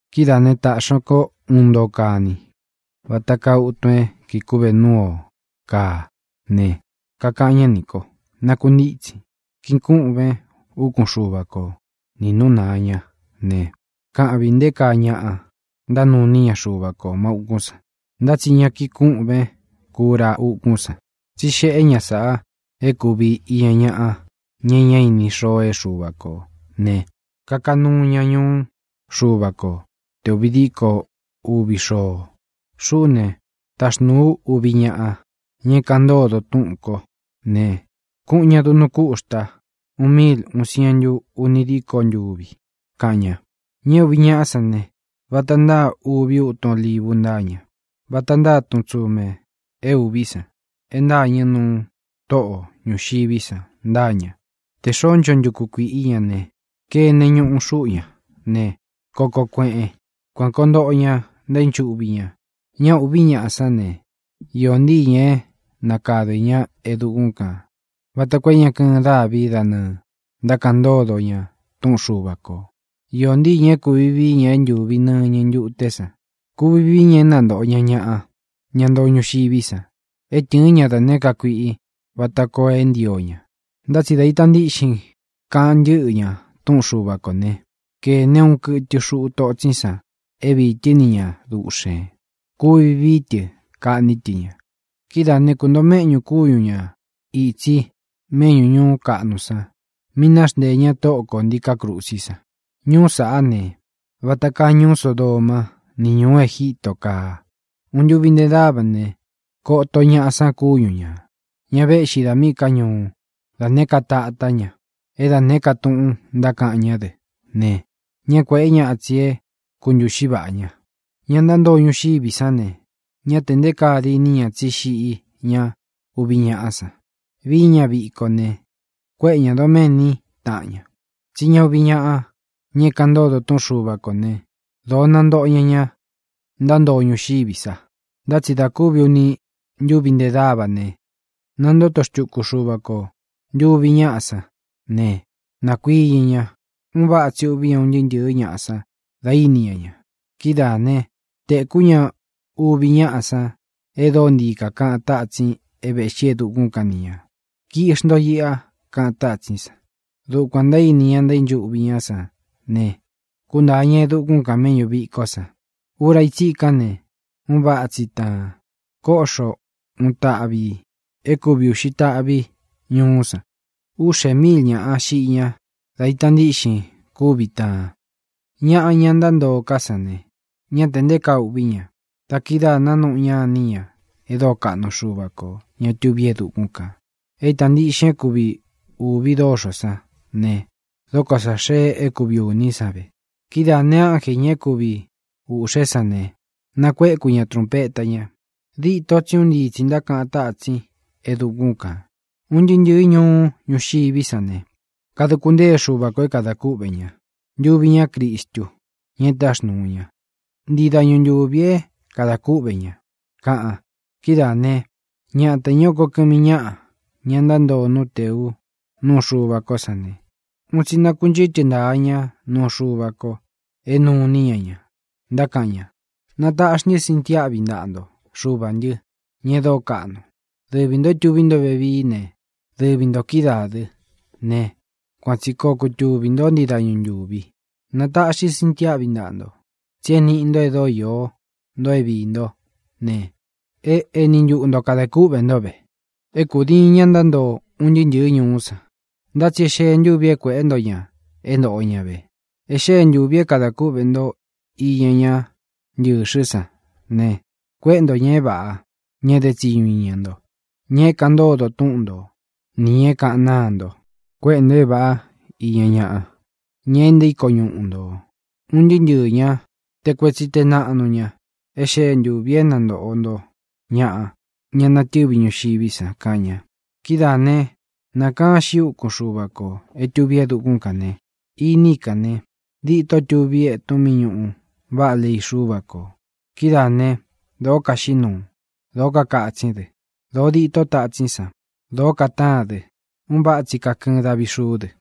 Kidáā né, tāꞌxi ña kó uun ntoo kani, vata kaa utun é kīꞌi kúꞌve núu ō káa ne, kakaꞌan ñá nī ko: —Nākuntítsin, kīꞌin kúꞌven úkun Xuva ko nī nú nāa ñá ne, kaꞌvin nté kaa ñaꞌa ntánuu iní ña Xuva kō má ūkún san. Ntá tsi ña kiꞌin kúꞌven kura ukún san, tsí xeꞌé ña sáꞌā é kūvi iña ñaꞌa, ña é ña íni xoo é Xuva kō ne, kaka nuu ña ñuú Xuva ko te ūvi díko uvi xoo. Xuꞌú ne, taxnūu ú uvi ñaꞌa, ña é kāꞌan ntódo túꞌūn kó ne, kuꞌun ña duꞌnu kúxta úun míil uvi sientu uni díko ntūvi —kaꞌan ña. Ña é uvi ñaꞌá san ne, vata ntáa uvi útun olívu ntáa ña. Vata ntáa tun tsumē é ūví san e ntâñɨ núu Toꞌo ñuxiví san ntáa ña. Tē xoó ncho ntukū kuiꞌi í ña ne, kene ñuꞌu xuꞌu ña ne, koko kueꞌen. Kuān koo ntoꞌo ña ntaínchuꞌvi ña. Ña uvi ñaꞌá san ne, īó ntii ñā é nakādɨ ñá e dukún kān vata koo é ña kɨɨn dávi da nɨɨ̄ ntákaꞌan ntódo ña túꞌun Xuva kō. Īó ntii ñā é kūvi vií ña é ntūvi nɨñɨ ntuté san ne, kuvi vií ña é nantōꞌo ña ñaꞌa, ña ntoo ñuxiví san, é tɨ̄ɨ́n ña da nēé ka kuiꞌi vata koo é ntio ña. Ntá tsi dā ita ntíꞌxin kaꞌan ntɨ́ꞌɨ ña túꞌun Xuva kō né, kēne uun kɨtɨ xuꞌu totsín san é viī tɨ́ ni ña duꞌxēn. Kuvi vií tɨ kaꞌní tɨ ña. Kidáā né, kuntōo méꞌñū kúñu ñā itsi méꞌñū ñuú kaꞌnu san mi náxnteē ñá Tóꞌo kō ntíkā krusí san. Ñuú sāꞌá ne, vata kaa ñuú Sodomá ni ñūú Egítō kaa. Úni ntūvi nte dáva ne, koto ñaꞌa san kúñu ñā, ña véꞌxi da míꞌī ká ñuú, da nēé ka tatá ña, é da nēé ka túꞌūn ntákaꞌan ñá dɨ ne, ñá kuēꞌé ña itsi é kuntūꞌxi váꞌa ña. Ña ntántoo ñuxiví san ne, ñá tē nté kaa diní ña tsí xiꞌí ña uvi ñaꞌá san. Vií ña viko ne, kuéꞌe ñā doméni táꞌan ña, tsí ña uvi ñaꞌa, ña é kaꞌan ntódo túꞌun Xuva kō né, dōó nantōꞌo ñá ña ntántoo ñuxiví sa. Ntá tsi da kúvi uni ntúvi ntē dávā ne, nantóto xtuku Xuva ko ntuvi ñáꞌa san ne, nākuiñɨ ña. Un váꞌa tsi ûꞌví un ntɨɨ́ ntɨ̄ɨ́ ñaꞌa san dá ini ña ña. Kidáā né, tēkú ña uvi ñaꞌá san e dóo ntii kakaꞌan tátsin é vēꞌxí e dukún kan ni ñā: —Kiꞌxi nto iꞌa —kaꞌan tátsín san. Dukuān ntaíni ña ntaínchuꞌvi ñá san ne, kúntāa ña e dukún kan mēꞌñú vikó san. Ura í tsikán ne, un váꞌa tsi taan. Kóꞌxo uun taꞌvi ī é kuvi ūꞌxi táꞌvi ñuú san. Úꞌxē míil ñāꞌa xiꞌi ñá da ita ntíꞌxin kúvi taan. Ñaꞌa, ña ntántoo ká san ne, ñá te nté kaa uꞌví ña. Da kidáā nanuꞌu ñá iní ña e dóo kaꞌnu Xuva kō, ña tuví e dukún kān. É īta ntíꞌxin é kuvi ūvi dóxō sán ne, e dóko sā xee é kuvi ūní san ve. Kidáā ne, ánjē, ña é kuvi ūꞌxé san ne, nakuēku ña trunpeta ña. Dîto tsí un ntii tsī ntákaꞌan tátsín e dukún kān: Un ntɨɨ́ ntɨ̄ɨ́ ñuú ñuxiví san ne, kaduku ntée Xuva kō é kadā kúꞌvē ña, ntuvi ñá Cristu, ña e táxnūu ña. Ntii dañu ntūvi é kadā kúꞌvē ña, kaꞌan. Kidáā né, ñatā, ña é oko kɨmi ñáꞌa, ña ntántoo nú tēu núu Xuva kó san ne, un tsi nákunchɨtɨ ntaā ñá nuu Xuva ko é nuu iní ña ña, ntákaꞌan ña: Nataꞌxi ntɨ́ sintiáꞌvi ntaꞌa nto, Xuvā ntɨ́, ña e dóo kaꞌnu. Dɨvi ntō é tuví nto vevií ne, dɨvi ntō kídaā dɨ́ ne, kuan tsi koo kutuvī ntó ntii dañu ntūvi. Nataꞌxi ntɨ́ sintiáꞌvi ntaꞌa nto, tsí e níꞌi nto e dóo iō nto é viī ntó ne, e éni ntuꞌu nto kadē kúꞌvē ntó ve. É kūdiin ña ntántoo un ntɨɨ́ ntɨ̄ɨ́ ñuú san, ntá tsi é xee ntúvi é kuēꞌé nto ña é ntōꞌo ña ve. E xée ntūvi é kadā kúꞌvē nto iña ñá ntɨ̄xɨ́ san ne, kuéꞌe nto ñā é vāꞌá, ña dé tsiñu iña nto, ña é kaꞌan ntódo túꞌun nto, nī ña é kāꞌan náa nto. Kuéꞌe ntō é vāꞌá iña ñaꞌa, ña e ntaíko ñuꞌu nto, un ntɨɨ́ ntɨɨ̄ ñá, te kuetsi, te naꞌnu ña. E xée ntūvi é nantōꞌo nto ñaꞌa, ña ntánatɨ̄ví ñuxiví san, kaꞌan ña. Kidáā né, nākaán xiꞌi úkun Xuva kō é tuví e dukún kān ne, iní i kān ne, dîtó tuví etun mí ñuꞌu váꞌa lei Xúva kō. Kidáā né, dōó kaxiꞌí nuu. Dōó kakatsín dɨ. Dōo dîtó tatsín san. Dōó katáan dɨ. Un váꞌa tsi kakɨɨn davi xuú dɨ.